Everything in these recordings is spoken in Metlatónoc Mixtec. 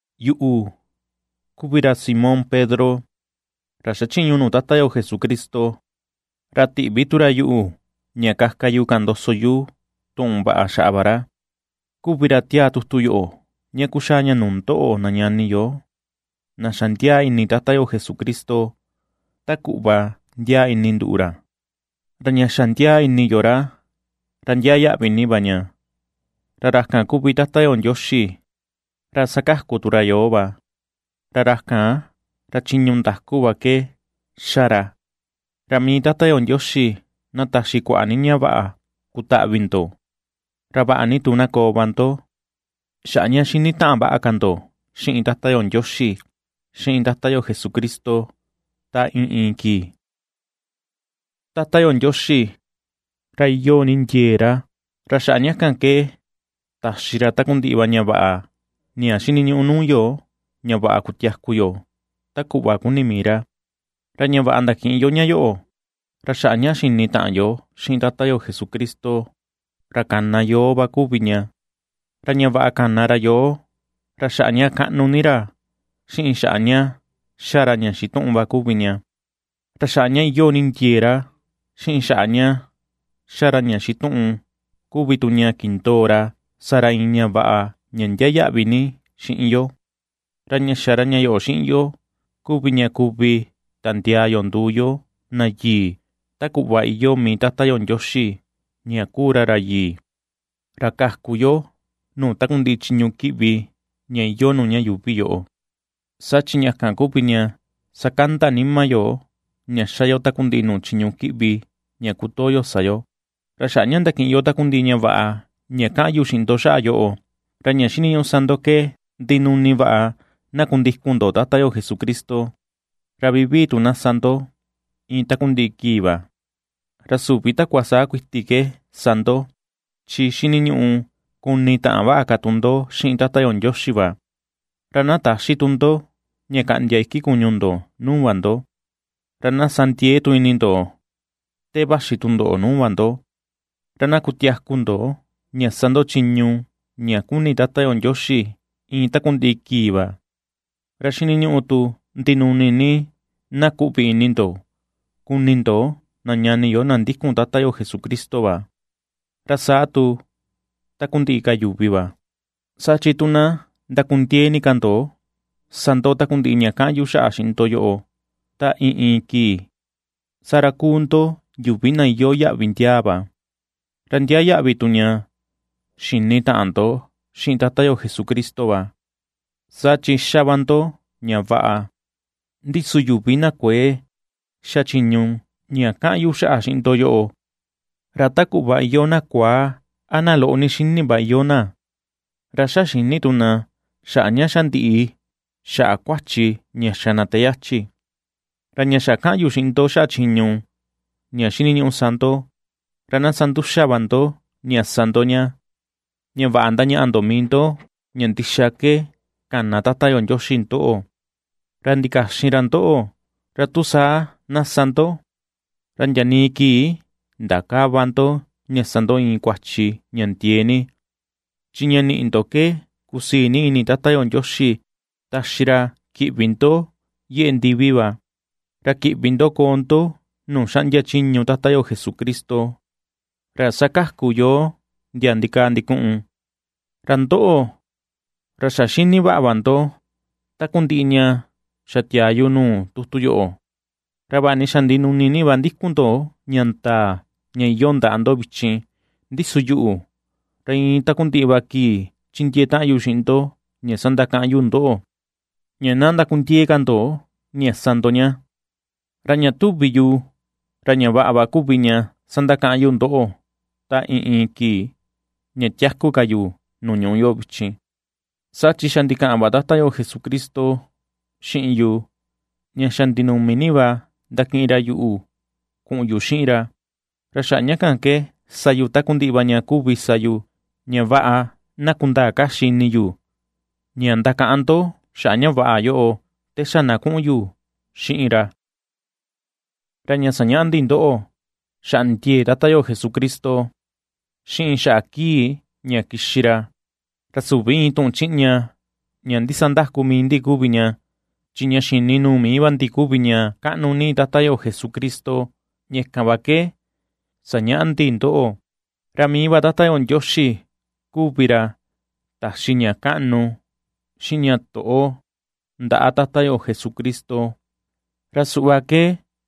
Yuꞌu, kuvi ra Simón Pedro, ra xachiñu nuu Tata yo Jesucristo, ra tiꞌvi tu ra yuꞌu ña kaka yu kaꞌan ndoso yu tuꞌun vaꞌa xaꞌa va ra, kuvi ra tiaa tutu yoꞌo ña kuxaa ña nuu ndoꞌo na ñani yo na xa ndiaa ini Tata yo Jesucristo, ta kuꞌva ndiaa ini nduꞌu ra; ra ña xa ndiaa ini yo ra, ra ndiaa yaꞌvi ni va ña; ra ra kan kuvi Tata yo Ndioxi, ra sakaku tu ra yoo va, ra ra kan, ra chiñu ndaku va ke ^xa ra. Ra mii Tata yo Ndioxi na taxi kuaꞌa ni ña vaꞌa kutaꞌvi ndo, ra vaꞌa ni tu na koo va ndo, xaꞌa ña ^xini taꞌan vaꞌa ka ndo xiꞌin Tata yo Ndioxi, xiꞌin Tata yo Jesucristo ta iin iin kii. Tata yo Ndioxi, ra iyoo ni ndiee ra, ra xaꞌa ña kan ke taxi ra takundiꞌi va ñaꞌa ña xiniñuꞌu nuu yo ña vaꞌa kutiaku yo ta kuꞌva kuni mii ra. Ra ña vaꞌa ndakiꞌin yo ña yoꞌo, ra xaꞌa ña xinitaꞌan yo xiꞌin Tata yo Jesucristo ra kana yoo va kuvi ña, ra ña vaꞌa kana ra yoo, ra xaꞌa ña kaꞌnu ni ra, xiꞌin xaꞌa ña ^xa ra ña xituꞌun va kuvi ña. Ra xaꞌa ña iyoo ni ndiee ra, xiꞌin xaꞌa ña ^xa ra ña xituꞌun kuvi tu ña kindoo ra sa ra iin ña vaꞌa ña ndiaa yaꞌvi ni xiꞌin yo; ra ña xa ra ña yoꞌo xiꞌin yo kuvi ña kuvi tandiaa yo nduu yo na yii ta kuꞌva iyoo mii Tata yo Ndioxi ña kuu ra ra yii, ra kaku yo nuu takundiꞌi chiñu kiꞌvi ña iyoo nuu ña yuuvi yoꞌo, saa chi ña kan kuvi ña sakanda nima yo ña xa yo takundiꞌi nuu chiñu kiꞌvi ña kutoo yo sa yo. Ra xaꞌa ña ndakiꞌin yo takundiꞌi ña vaꞌa ña ^kaꞌan yu xiꞌin ndo xaꞌa yoꞌo, ra ña xiniñuꞌu sa ndo ke ndinuni vaꞌa na kundikun ndo Tata yo Jesucristo, ra vivii tu na sa ndo iin takundiꞌi kii va, ra süvi takua sa kuiti ke sa ndo, chi xiniñuꞌu kunitaꞌan vaꞌa ka tu ndo xiꞌin Tata yo Ndioxi va, ra na täxi tu ndo ña kaꞌndia iki kuñu ndo nuu va ndo; ra na ^sa ndiee tu ini ndo te vaxi tundoꞌo nuu va ndo, ra na ^kutiaku ndo ña sa ndo chiñu ña kuni Tata yo Ndioxi iin takundiꞌi kii va. Ra xiniñuꞌu tu ndinuni ni na kuꞌvi ini ndo kuni ndo na ñani yo na ndikun Tata yo Jesucristo va, ra saa tu takundiꞌi ka yuvi va. Saa chi tu na ndakundiee ni ka ndo sa ndo takundiꞌi ña kaꞌan yu xaꞌa xiꞌin ndo yoꞌo ta iin iin kii, saa ra kuu ndo yuvi na iyoo yaꞌvi ndiaa va, ra ndiaa yaꞌvi tu ña xini taꞌan ndo xiꞌin Tata yo Jesucristo va, saa chi ^xa va ndo ña vaꞌa. Ndi su yuvi na kuëe ^xa chiñu ña kaꞌan yu xaꞌa xiꞌin ndo yoꞌo, ra ta kuꞌva iyoo na kuaa a na loꞌo ni xini va iyoo na; ra ^xa xïni tu na xaꞌa ña xa ndiꞌi xaꞌa kuachi ña xa na te yachi va. Ra ña xa ^kaꞌan yu xiꞌin ndo xaꞌa chiñu ña xiniñuꞌu sa ndo, ra na sa nduxa va ndo ña ^sa ndo ña, ña vaꞌa ndañaꞌa ndo mii ndo ña ndixa ke kana Tata yo Ndioxi ndoꞌo, ra ndikaxin ra ndoꞌo, ra tu saa na ^sa ndo, ra ndiaa nii kii ndakäva ndo ña sa ndo iin kuachi ña ndiee ni. Chi ña niꞌi ndo ke kusii ni ini Tata yo Ndioxi taxi ra kiꞌvi ndo yeꞌe ndivi va, ra kiꞌvi ndo koo ndo nuu xaꞌndia chiñu Tata yo Jesucristo, ra sakaku yoo ndia ndikaa ndikuꞌun. Ra ndoꞌo, ra xa xini vaꞌa va ndo takundiꞌi ña xa tiaa yu nuu tutu yoꞌo, ra vaꞌa ni xa ndinuni ni va ndikun ndo ña ndaa ña iyoo ndaꞌa ndo vichin, ndi su yuꞌu, ra iin takundiꞌi va kii chindiee taꞌan yu xiꞌin ndo ña sandakaꞌan yu ndoꞌo ña na ndakundiee ka ndo ña sa ndo ña. Ra ña tuvi yu ra ña vaꞌa va kuvi ña sandakaꞌan yu ndoꞌo ta iin iin kii ña tiaku ka yu nuu ñuꞌu yoꞌo vichin, saa chi xa ndikaꞌan va Tata yo Jesucristo xiꞌin yu ña xa ndinumi ni va ndakiꞌin ra yuꞌu kuꞌun yu xiꞌin ra. Ra xaꞌa ña kan ke sa yu takundiꞌi va ña kuvi sa yu, ña vaꞌa na kundaa kaxi ini yu ña ndakaꞌan ndo xaꞌa ña vaꞌa yoꞌo, te xa na kuꞌun yu xiꞌin ra. Ra ña sañaꞌa ndi ndoꞌo, xaꞌa ndiee Tata yo Jesucristo, xiꞌin xaꞌa kii ña kixi ra, ra süvi iin tuꞌun chiꞌña ña ndisandaku mii ndi kuvi ña, chi ña xini nuu mii va ndi kuvi ña kaꞌnu ni Tata yo Jesucristo ña kan va ke sañaꞌa ndi ndoꞌo. Ra mii va Tata yo Ndioxi kuvi ra taxi ña kaꞌnu, xiꞌin ña toꞌo ndaꞌa Tata yo Jesucristo, ra suꞌva ke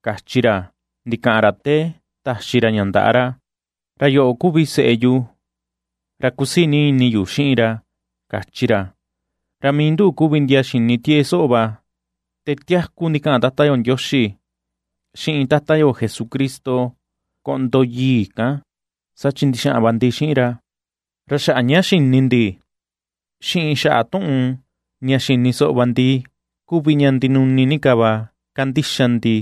kachi ra ndikaꞌan ra te taxi ra ña ndaꞌa ra: “Ra yoꞌo kuvi seꞌe yu, ra kusii ni ini yu xiꞌin ra”, kachi ra. Ra mii nduꞌu kuvi ndia xini tieꞌe soꞌo va te tiaku ndikaꞌan Tata yo Ndioxi xiꞌin Tata yo Jesucristo koꞌndo yii kan, saa chi ndixaꞌan va ndi xiꞌin ra. Ra xaꞌa ña xini ndi xiꞌin xaꞌa tuꞌun ña xini soꞌo va ndi kuvi ña ndinuni ni ka va kandixa ndi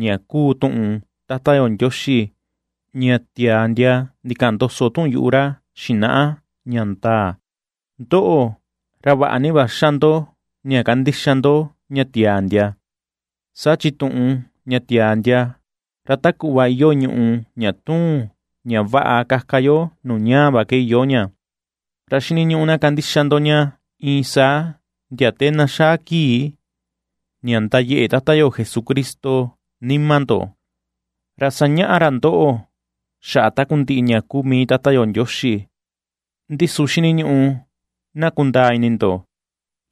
ña kuu tuꞌun Tata yo Ndioxi ña tiaa ndia ndikaꞌan ndoso tuꞌun yuꞌu ra xinaꞌa ña ndaa. Ndoꞌo, ra vaꞌa ni va xa ndo ña kandixa ndo ña tiaa ndia, saa chi tuꞌun ña tiaa ndia, ra ta kuꞌva iyoo ñuꞌu ña tuun ña vaꞌa kaka yo nuu ñaa va ke iyoo ña, ra xiniñuꞌu na kandixa ndo ña iin saa ndia te na xaa kii ña ndayeꞌe Tata yo Jesucristo nima ndo, ra sañaꞌa ra ndoꞌo xaꞌa takundiꞌi ña kuu mii Tata Ndioxi. Ndi su xiniñuꞌu na kundaa ini ndo,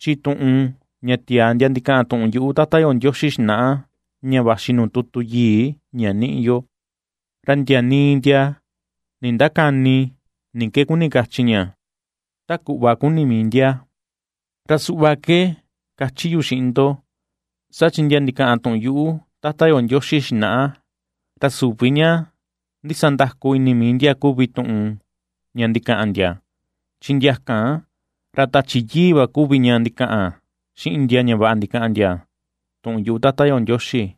chi tuꞌun ña tiaa ndia ndikaꞌan tuꞌun yuꞌu Tata yo xinaꞌa ña vaxi nuu tutu yii ña niꞌi yo, ra ndia nii ndia nindakäni ni ke kuni kachi ña, ta kuꞌva kuni mii ndia. Ra suꞌva ke ^kachi yu xiꞌin ndo, saa chi ndia ndikaꞌan tuꞌun yuꞌu Tata yo Ndioxi xinaꞌa, ra süvi ña ndisandaku ini mii ndia kuvi tuꞌun ña ndikaꞌan ndia. Chi ndia kan, ra Tachi Yii va kuvi ña ndikaꞌan xiꞌin ndia ña vaꞌa ndikaꞌan ndia tuꞌun yuꞌu Tata yo Ndioxi.